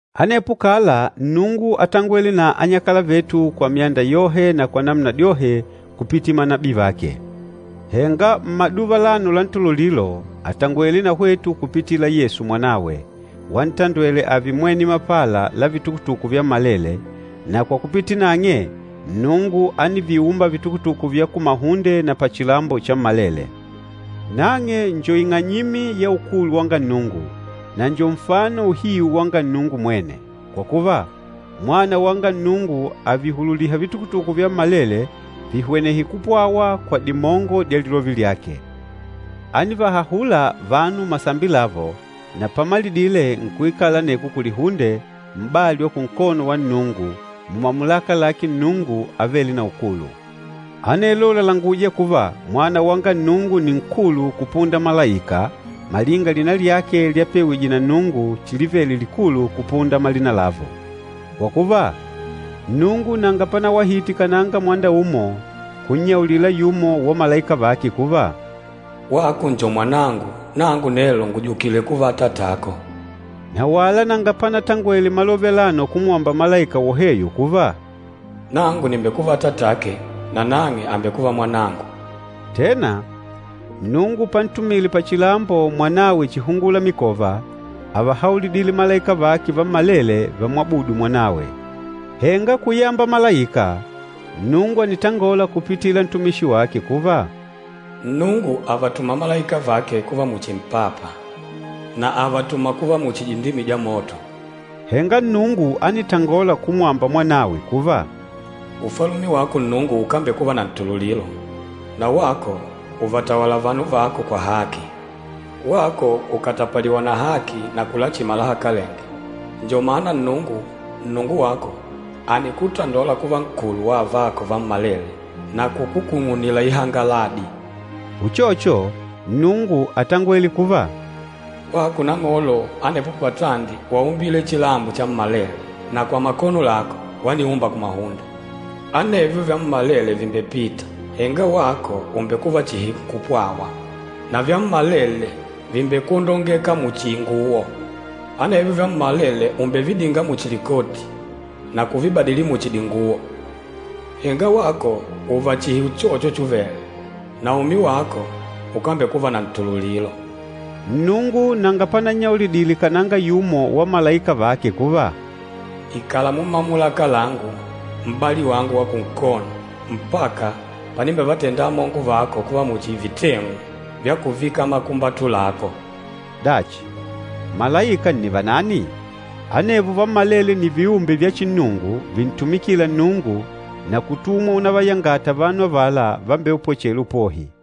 Anepo kala Nnungu átangwele na anyakala vetu kwa myanda yohe na kwa namuna dyohe kupitila manabii vake. Henga mmaduva alano la ntululilo àtangwele na hwetu kupitila Yesu Mwanawe, wantandwele ààve mwene mapala la vitukutuku vyammalele, na kwa kupitila nang'e, Nnungu ániviumba vitukutuku vya kumahunde na pachilambo chammalele. Nang'e njo ing'anyimi ya ukulu wanga Nnungu, na njo nfano uhiu wanga Nnungu mwene. Kwa kuva, Mwana wanga Nnungu àvihululiha vitukutuku vyammalele vihwenehe kupwawa kwa dimongo dya lilove lyake. Ánivahahula vanu masambi lavo, na pamalidile nkuikala aneko kulihunde, m'bali wa kunkono wa Nnungu, mumamulaka lake Nnungu Avêle na Ukulu. Anelo làlanguja kuva Mwana wanga Nnungu nni nkulu kupunda malaika malinga lina lyake lyapewije na Nnungu chilivele likulu kupunda malina lavo. Kwa kuva, Nnungu nanga panawahite kananga mwanda umo kunnyaulila yumo wa malaika vake kuva, “Wako njo Mwanangu, nangu nelo ngùjukile kuva Atatako.” Na wala nanga panatangwele malove alano kumwamba malaika woheyo kuva, “Nangu nìmbekuva Atatake, na nang'e àmbekuva Mwanangu.” Tena, Nnungu pantumile pachilambo Mwanawe chihungumikova, ávahaulidile malaika vake vammalele vamwabudu Mwanawe. Henga kuyamba malaika, Nnungu ànitangola kupitila ntumishi wake kuva, “Nnungu àvatuma malaika vake kuva muchi mpapa, na àvatuma kuva muchi dindimi dya moto.” Henga Nnungu ánitangola kumwamba Mwanawe kuva, “Ufalume wako Nnungu ukámbekuva na ntululilo. Na wako ùvatawala vanu vako kwa haki. Wako ùkatapaliwa na haki na kulachima lahakalenge. Njo mana Nnungu, Nnungu wako ànikutandola kuva nkulu wa avako vammalele, na kukukung'unila ihangaladi.” Uchocho, Nnungu átangwele kuva, “Wako Nang'olo, anepo patandi waumbile chilambo chammalele, na kwa makono lako waniumba kumahunde. Anevyo vyammalele vìmbepita, henga wako ùmbekuva chihi nkupwawa. Na vyammalele vìmbekwondongeka muchi inguwo. Anevyo vyammalele ùmbevidinga muchi likoti, na kuvibadili muchi dinguwo. Henga wako ùùva chihi uchocho chuvele, na umi wako ukambekuva na ntululilo.” Nnungu nanga panannyaulidile kananga yumo wa malaika vake kuva, “Ikala mumamulaka langu, m'bali wangu wa kunkono, mpaka panimbevatenda amongo vako kuva muchi viteng'u vya kuvika makumbatu lako.” Dachi, malaika nni vanani? Anevo vammalele nni viumbe vya chinnungu vintumikîla Nnungu na kutumwa unavayangata vanu avala vambeupwechêla upohi.